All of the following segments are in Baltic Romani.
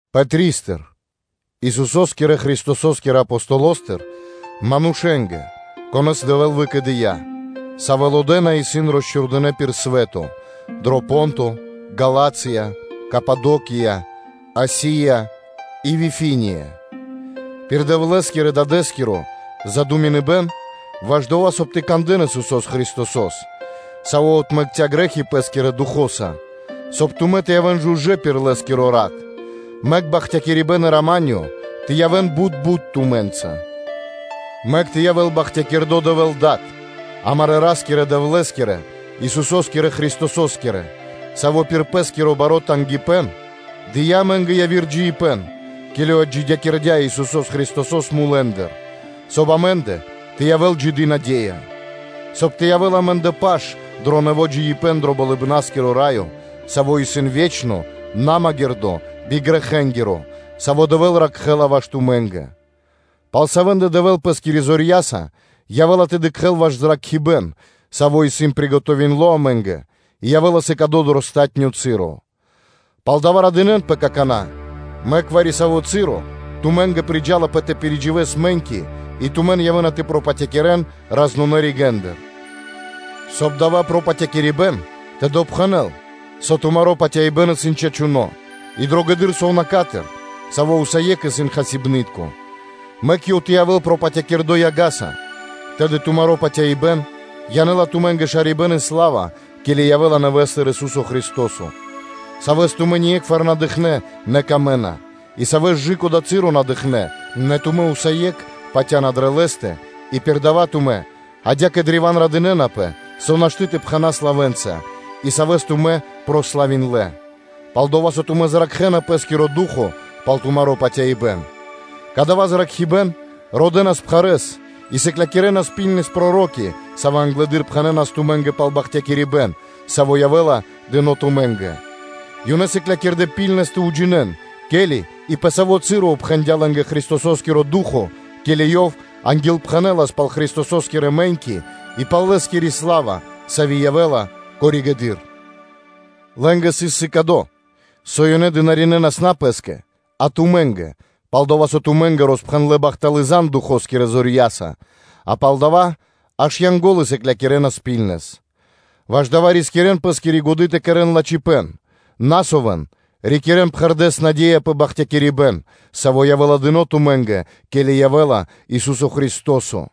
Пэтристыр, Исусо́скирэ Христосо́скирэ Апостолостыр, манушэ́нгэ, конэ́с Дэвэ́л выкэдыя́, савэ́ лодэна и исын росчхурдынэ пир свэ́то, дро Понто, Галатия, Кападокия, Асия и Вифиния, пир Дэвлэ́скирэ-Дадэ́скиро задуминыбэн ваш дова́, соб (кай) тэ кандэ́н Исусо́с Христосо́с, Саво́ отмэкця́ грэ́хи Лэ́скирэ Духо́са, соб (кай) тумэ́ тэ явэ́н помакхнэ Лэ́скирэ Ратэ́са: мэк бахтякирибэ́н и рама́нё (миро) тэ явэ́н бут бут тумэ́нгэ. Мэк тэ явэ́л бахтякирдо́ Дэвэ́л Дад амарэ́ Ра́скирэ-Дэвлэ́скиро, Исусо́скирэ Христосо́скиро, Саво́ пир Пэ́скиро баро́ тангипэ́н дыя́ амэ́нгэ яви́р джиибэ́н, ке́ли отджидякирдя́ Исусо́с Христосо́с мулэ́ндыр, соб (кай) амэ́ндэ тэ явэ́л джиды наде́я, соб (кай) тэ явэ́л амэ́ндэ паш дро нэво́ джиибэ́н дро Болыбна́скиро Раё, саво́ исын ве́чно, намагирдо, бигрэхэнгиро, саво́ Дэвэ́л ракхэ́ла ваш тумэ́нгэ. Пал савэ́ндэ Дэвэ́л Пэ́скирэ зорья́са явэ́ла тэ дыкхэ́л ваш зракхибэ́н, саво́ исын приготовиндло амэ́нгэ и явэ́ла сыкадо дро палатуно́ часо. Пал дава́ радынэ́нпэ какана́, мэк вари-саво́ часо тумэ́нгэ приджалапэ тэ пиридживэс мэ́ньки и тумэн явэ́на тэ пропатякирэн разнонэ ригэ́ндыр, соб (кай) дава́ пропатякирибэн тэ допхэнэл, со тумаро́ патяибэ́н исын чачуно́ и дрогэдыр сувнака́стыр, саво́ усае́кх исын хасибны́тко, мэк ёв тэ явэ́л пропатякирдо яга́са, тэды тумаро́ патяибэ́н янэ́ла тумэ́нгэ шарибэ́н и сла́ва, ке́ли явэ́ла нэвэ́стыр Ису́со Христо́со: Савэс тумэ́ ние́кхвар на дыкхнэ́, нэ Ёв исын дро́го тумэ́нгэ, и Савэс кэ дава́ часо на дыкхнэ́, нэ тумэ́ усае́кх патя́на дрэ Лэ́стэ и пир дава́ тумэ́ адя́кэ древа́н радынэ́напэ, со нашты́ тэ пхэнас лавэ́нца, и Савэс тумэ́ прославиндлэ, пал-дова́ со тумэ́ зракхэна пэ́скиро ду́хо (фа́но) пал тумаро́ патяибэ́н. Кадава́ зракхибэ́н родэнас пхарэ́с и сыклякирэнас лачхэ́с проро́ки, савэ́ англэды́р пхэнэнас тумэ́нгэ пал бахтякирибэ́н, саво́ явэ́ла дыно́ тумэ́нгэ. Ёнэ сыклякирдэ́ миштэ́с тэ уджинэ́н, ке́ли и пэ саво́ часо (цы́ро) упхэндя Христосо́скиро Ду́хо (Фа́но), ке́ли Ёв ангилпхэнэлас пал Христосо́скирэ мэ́ньки и пал Лэ́скири сла́ва, сави́ явэ́ла коригэды́р (позжэ). Лэ́нгэ сыс сыкадо, со ёнэ дынаринэ́нас (служынэ́нас) на пэ́скэ, а тумэ́нгэ, пал-дова́ со тумэ́нгэ роспхэндлэ́ бахталы́ зан (звесь) Духо́скирэ зорья́са, а пал дава́ аж Янго́лы сыклякирэнас миштэ́с. Ваш дава́ рискирэ́н пэ́скири годы́ тэ кэрэ́н лачхипэ́н, на совэн, рикирэ́н пхэрдэ́с наде́я пэ бахтякирибэ́н, саво́ явэ́ла дыно́ тумэ́нгэ, ке́ли явэ́ла Ису́со Христо́со;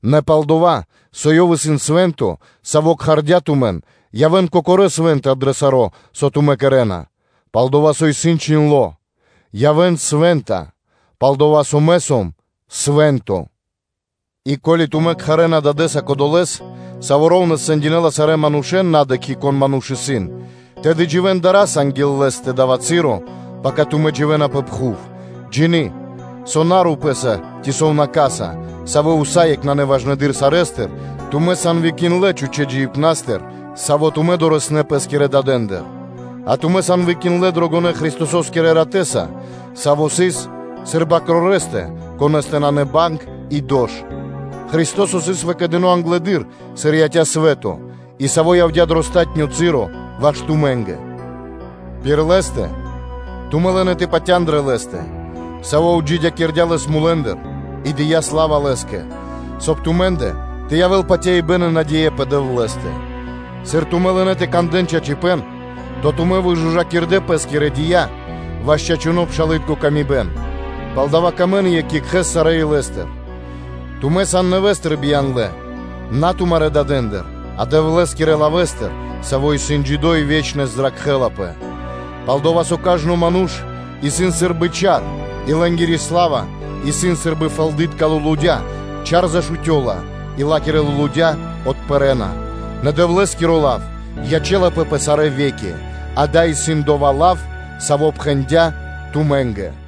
нэ пал-дова́ со Ёв исын Свэ́нто, Саво́ кхардя́ тумэн, явэ́н кокорэ́ свэ́нта дро саро́, со тумэ́ кэрэ́на; пал-дова́ со исын чхиндло́: “Явэ́н свэ́нта, пал-дова́ со Мэ сом Свэ́нто.” И ко́ли тумэ́ кхарэ́на Дадэ́са Кодолэ́с, Саво́ шэра́ (ра́внэс) сэндякирэ́ла сарэ́ манушэ́н, на дыкхи́, кон ману́ш исын, тэды дживэ́н дара́са анги́л Лэ́стэ дава́ часо, пака тумэ́ дживэ́на пэ пхув; джины́, со на рупэ́са ци сувнака́са, савэ́ усае́кх нанэ важнэдыр сарэ́стыр, тумэ́ сан выкиндлэ чхучэ́ (пустонэ) джиибнастыр, саво́ тумэ́ дорэснэ́ пэ́скирэ дадэндыр; а тумэ́ сан выкиндлэ дрогонэ́ Христосо́скирэ Ратэ́са, Саво́ сыс сыр Свэ́нто Бакроро́, Конэ́стэ на сыс банг и дош. Христо́со сыс выкэдыно англэды́р, сыр яця́ свэ́то и Саво́ явдя́ дро палатуно́ часо ваш тумэ́нгэ; пир Лэ́стэ тумэ́ лынэ́ тэ патя́н дрэ Лэ́стэ, Саво́ отджидякирдя́ Лэс мулэ́ндыр и дыя́ сла́ва Лэ́скэ, соб (кай) тумэ́ндэ тэ явэ́л патяибэ́н и наде́я пэ Дэвлэ́стэ. Сыр тумэ́ лынэ́ тэ кандэ́н чачипэ́н, тэды тумэ́ выжужакирдэ пэ́скирэ дия́ ваш чачуны́ пшалы́тко паты́в, палдава́ сыкавэ́н паты́в екх екхэ́скэ сарэ́ илэ́стыр. Тумэ́ сан нэвэ́стыр бияндлэ, на тумарэ́ дадэндыр, а Дэвлэ́скирэ лавэ́стыр, саво́ исын джидо́, и саво́ ве́чнэс зракхэ́лапэ. Пал-дова́ со “кажно ману́ш исын сы́рбы чар, и лэ́нгири сла́ва исын сы́рбы фэлды́тка лулудя́ (цвэты), чар зашутёла и ла́кирэ лулудя́ отпэрэна. Нэ Дэвлэ́скиро лав ячэ́лапэ пэ сарэ́ ве́ки.” Адава́ исын дова́ лав, саво́ пхэндяпэ тумэ́нгэ.